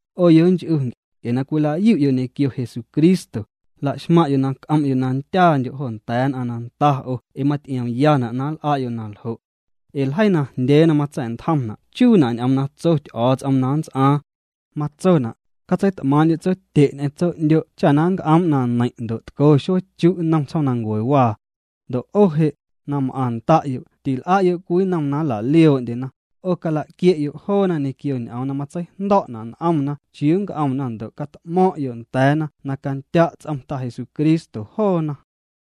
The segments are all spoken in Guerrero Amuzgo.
'O yonch'u, nc'e na cwila'yu'yo' ñequio Jesucristo, laxmaⁿ'yo' na c'om'yo' na ndyaandyo' jo nda̱a̱ nn'aⁿ na nda o' ee maty'iomyana' na nl'a'yo' naljo'. Ee ljeii najndyee na matsa̱'ntjomna' chuuna' ñ'oom na tso Ty'o̱o̱ts'om na nnts'aaⁿ. Matsona': “Catseit'maaⁿ'ndyu' tsotye' ñ'eⁿ tso'ndyo' cha na nnc'oom' na neiⁿ' ndo' tco xueechu' nnom tsjoomnancuewaa.” Ndo' 'o je', na m'aⁿ nda'yo' til'a'yo' cwii nnom na nla'lioo'ndyena, 'o cala'quie'yo' joona ñequio ñ'oom na matseijndo̱'na' n'omna chiuu nnc'omna ndo' cat'mo̱ⁿ'yo' nda̱a̱na na candya' ts'om Ta Jesucristo joona.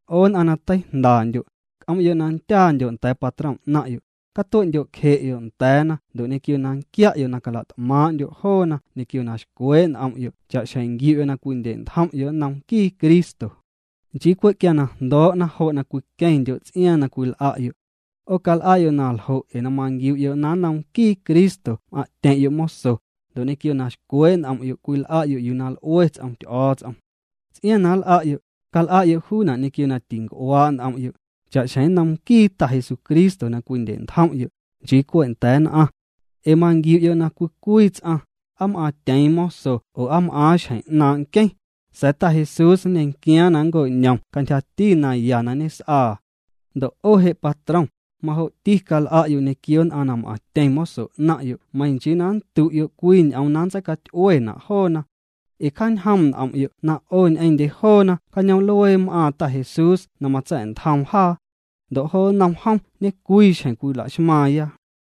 'O nn'aⁿ na teijndandyo', c'om'yo' na ndyaandyo' nda̱a̱ patrom 'naⁿ'yo', catue'ndyo'cje'yo' nda̱a̱na ndo' ñequio na nquia'yo cala't'maaⁿ'ndyo' joona ñequio na xcwee' n'om'yo' cha'xjeⁿ nquiu'yo' na cwindye'ntjom'yo' nnom nquii Cristo. Nchii cwe' quia na jndoo'na jo' na cwiqueⁿndyo' ts'iaaⁿ na cwil'a'yo'. 'O cal'a'yo' na ljo' ee na manquiu'yo' na nnom nquii Cristo m'aⁿ'tyeⁿ'yo' moso, ndo' ñequio na xcwee' n'om'yo' cwil'a'yo' yuu na l'ue ts'om Ty'o̱o̱ts'om. Ts'iaaⁿ na nl'a'yo', cal'a'yo' juuna' ñequio na tinc'uaa' n'om'yo', cha'xjeⁿ nnom nquii Ta Jesucristo na cwindye'ntjom'yo', nchii cwe' nda̱a̱ nn'aⁿ. Ee manquiu'yo' na cwii cwii ts'aⁿ, aa m'aaⁿtyeeⁿ moso oo aa m'aaⁿ xjeⁿ 'naaⁿ' nqueⁿ, sa̱a̱ Ta Jesús nñequiaaⁿ na nnco'ñom cantyjati na ya na ñes'aa. Ndo' 'o je' patrom, majo'ti cal'a'yo' ñequio nn'aⁿ na m'aⁿtyeⁿ moso 'naⁿ'yo' meiⁿ nchii na nndu'yo' cwii ñ'oom na ntseicaty'uena' joona. Ee cjañjoom' n'om'yo' na 'o ñ'eⁿndye joona cañoom'luee m'aaⁿ Ta Jesús na matsa̱'ntjoom jaa. Ndo' jo nnom jom ñecwii xjeⁿ cwila'xmaaⁿya.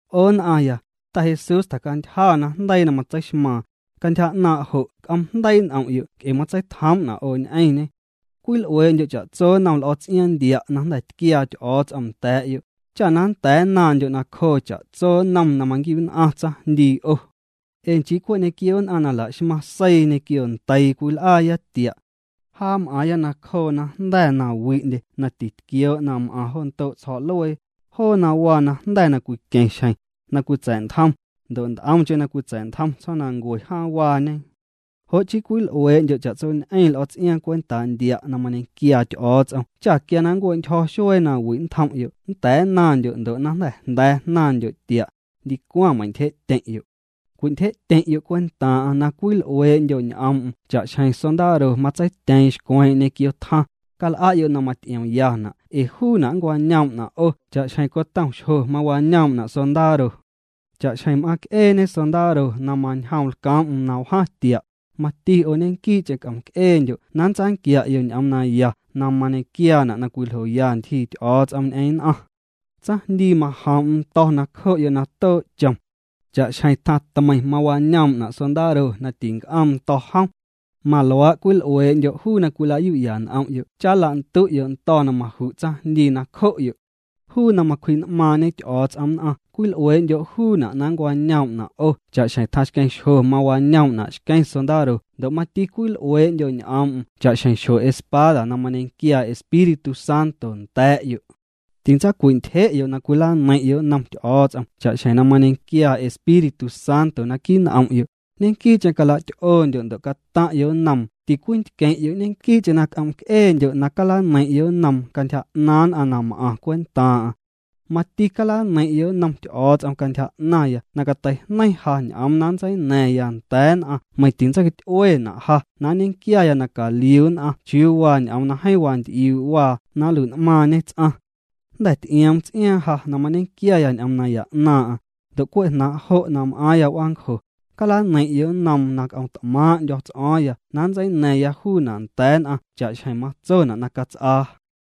'O nn'aⁿya, Ta Jesús tjacantyja najndeii na matseixmaaⁿ. Cantyja 'naaⁿ' jo' c'oom' jndeii' n'om'yo' nc'e matseitjoom'na' 'o ñ'eⁿñê. Cwil'uee'ndyo' cha'tso nnom l'o̱ ts'iaaⁿ ndia' na jnda̱ tquiaa Ty'o̱o̱ts'om nda̱a̱'yo', cha na nnda̱a̱ nnaⁿndyo' nacjoo' cha'tso nnom na manquiu'nn'aⁿ tsaⁿjndii 'o. Ee nchii cwe' ñequio nn'aⁿ na la'xmaⁿ seii ñequio ndeii cwil'aaya tia'. Jaa m'aaⁿya nacjoo najnda̱ na wi'ndye na titquioo' na m'aⁿ jo ndo' ljo̱'luee, joo na waa najnda̱ na cwiqueⁿ xjeⁿ, na cwitsa̱'ntjom, ndo' nt'omcheⁿ na cwitsa̱'ntjom tsjoomnancue jaaⁿwaañe. Jo' chii cwil'uee'ndyo' cha'tsoñ'eⁿ l'o̱ ts'iaaⁿ cwentaa ndia' na mañequiaa Ty'o̱o̱ts'om cha quia na nncue'ntyjo̱ xuee na wi' nntjom'yo' nnda̱a̱ nnaⁿndyo' ndo' na jnda̱ jnda̱a̱ jnaⁿndyo' tia', ndicwaⁿ meiⁿntyje'tyeⁿ'yo'. Cwintyje'tyeⁿ'yo' cwentaaⁿ'aⁿ na cwil'uee'ndyo' ñ'oom'm cha'xjeⁿ sondaro matseityeeⁿ xcweeⁿ'eⁿ ñequio tjaⁿ, cal'a'yo' na maty'iomyana' ee juuna' nncwañoom'na' 'o cha'xjeⁿ cotom xjo wañoom'na' sondaro. Cha'xjeⁿ m'aaⁿc'eeñe sondaro na mañjoom lcoom'm na wjaⁿ tia', mati 'o ñequii'cheⁿ c'om'c'eendyo' na nntsanquia'yo' ñ'oom na ya na mañequiaana' na cwiljoya ntyjii Ty'o̱o̱ts'om ñ'eⁿ nn'aⁿ. Tsaⁿjndii majoom'm ndo̱ nacjo'yo' na too' chom. Cha'xjeⁿ tjaⁿ tmeiⁿ mawañoom'na' sondaro na tinc'oom ndo̱ jom, maluaa' cwil'uee'ndyo' juu na cwilayu'ya n'om'yo' cha nlandu'yo' ndo̱ na maju' tsaⁿjndii nacjo'yo'. Juu na macwji'n'maaⁿ'ñe Ty'o̱o̱ts'om nn'aⁿ cwil'uee'ndyo' juuna' na nncwañoom'na' 'o cha'xjeⁿ tjaⁿxqueⁿ xjo' mawañoom'na' xqueⁿ sondaro ndo' mati cwil'uee'ndyo' ñ'oom'm cha'xjeⁿ xjo espada na mañequiaa Espíritu Santo nda̱a̱'yo'. Tintsacwintyje'yo' na cwilaneiⁿ'yo' nnom Ty'o̱o̱ts'om cha'xjeⁿ na mañequiaa Espíritu Santo naquii' n'om'yo', ñequii'cheⁿ cala'ty'oondyo' ndo' cataⁿ'yo' nnoom, tincwintqueⁿ'yo', ñequii'cheⁿ na c'om'c'eendyo' na calaneiⁿ'yo' nnoom cantyja 'naaⁿ nn'aⁿ na m'aⁿ cwentaaⁿ'aⁿ. Mati calaneiⁿ'yo' nnom Ty'o̱o̱ts'om cantyja 'naⁿya na cateijneiⁿ ja ñ'oom na nntseina̱ⁿya nnda̱a̱ nn'aⁿ meiⁿ tintseicaty'uena' ja na nñequiaya na caliu nn'aⁿ chiuu waa ñ'oom na jeeⁿ wanty'iuu' waa na nlui'n'maaⁿñe ts'aⁿ. Jnda̱ ty'ioom ts'iaaⁿ ja na mañequiaya ñ'oom naya 'naaⁿ'aⁿ, ndo' cwe' jnaaⁿ' jo' na m'aaⁿya w'aancjo, calaneiⁿ'yo' nnoom na c'o̱ⁿt'maaⁿ'ndyo̱ ts'o̱o̱ⁿya na nntseina̱ⁿya juuna' nda̱a̱ nn'aⁿ cha'xjeⁿ matsona' na cats'aa.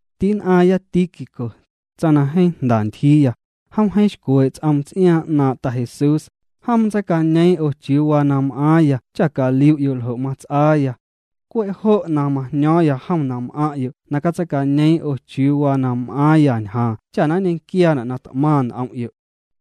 Ti'nn'aⁿya Tíquico, tsaⁿ na jeeⁿ jnda ntyjiiya, jom jeeⁿ xcwee' ts'oom ts'iaaⁿ 'naaⁿ' Ta Jesús, jom ntseicañeeⁿ 'o chiuu waa na m'aaⁿya cha caliu'yo' ljo' mats'aaya. Cwe' jo' na majño̱o̱ⁿya jom na m'aⁿ'yo' na catseicañeeⁿ 'o chiuu waa na m'aaⁿya ñjaaⁿ cha na nñequiaana' na t'maⁿ n'om'yo'.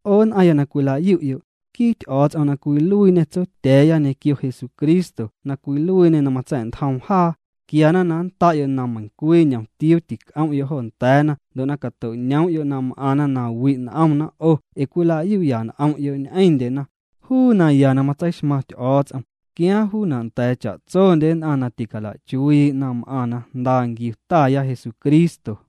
'O nn'aⁿya na cwila'yu'yo', nquii Ty'o̱o̱ts'om na cwiluiiñê Tsotya̱a̱ya ñequio Jesucristo na cwiluiiñê na matsa̱'ntjoom jaa, quiana na nnda'yo' na meiⁿcwii ñomtiuu tic'om'yo' jo nda̱a̱na ndo' na cato'ñoom'yo' na m'aⁿna na wi' n'omna 'o ee cwila'yu'ya n'om'yo' ñ'eⁿndyena, juu naya na matseixmaⁿ Ty'o̱o̱ts'om, quiaaⁿ juuna' nda̱a̱ cha'tsondye nn'aⁿ na ticala'chuii' na m'aⁿ na jnda nquiu Taya Jesucristo.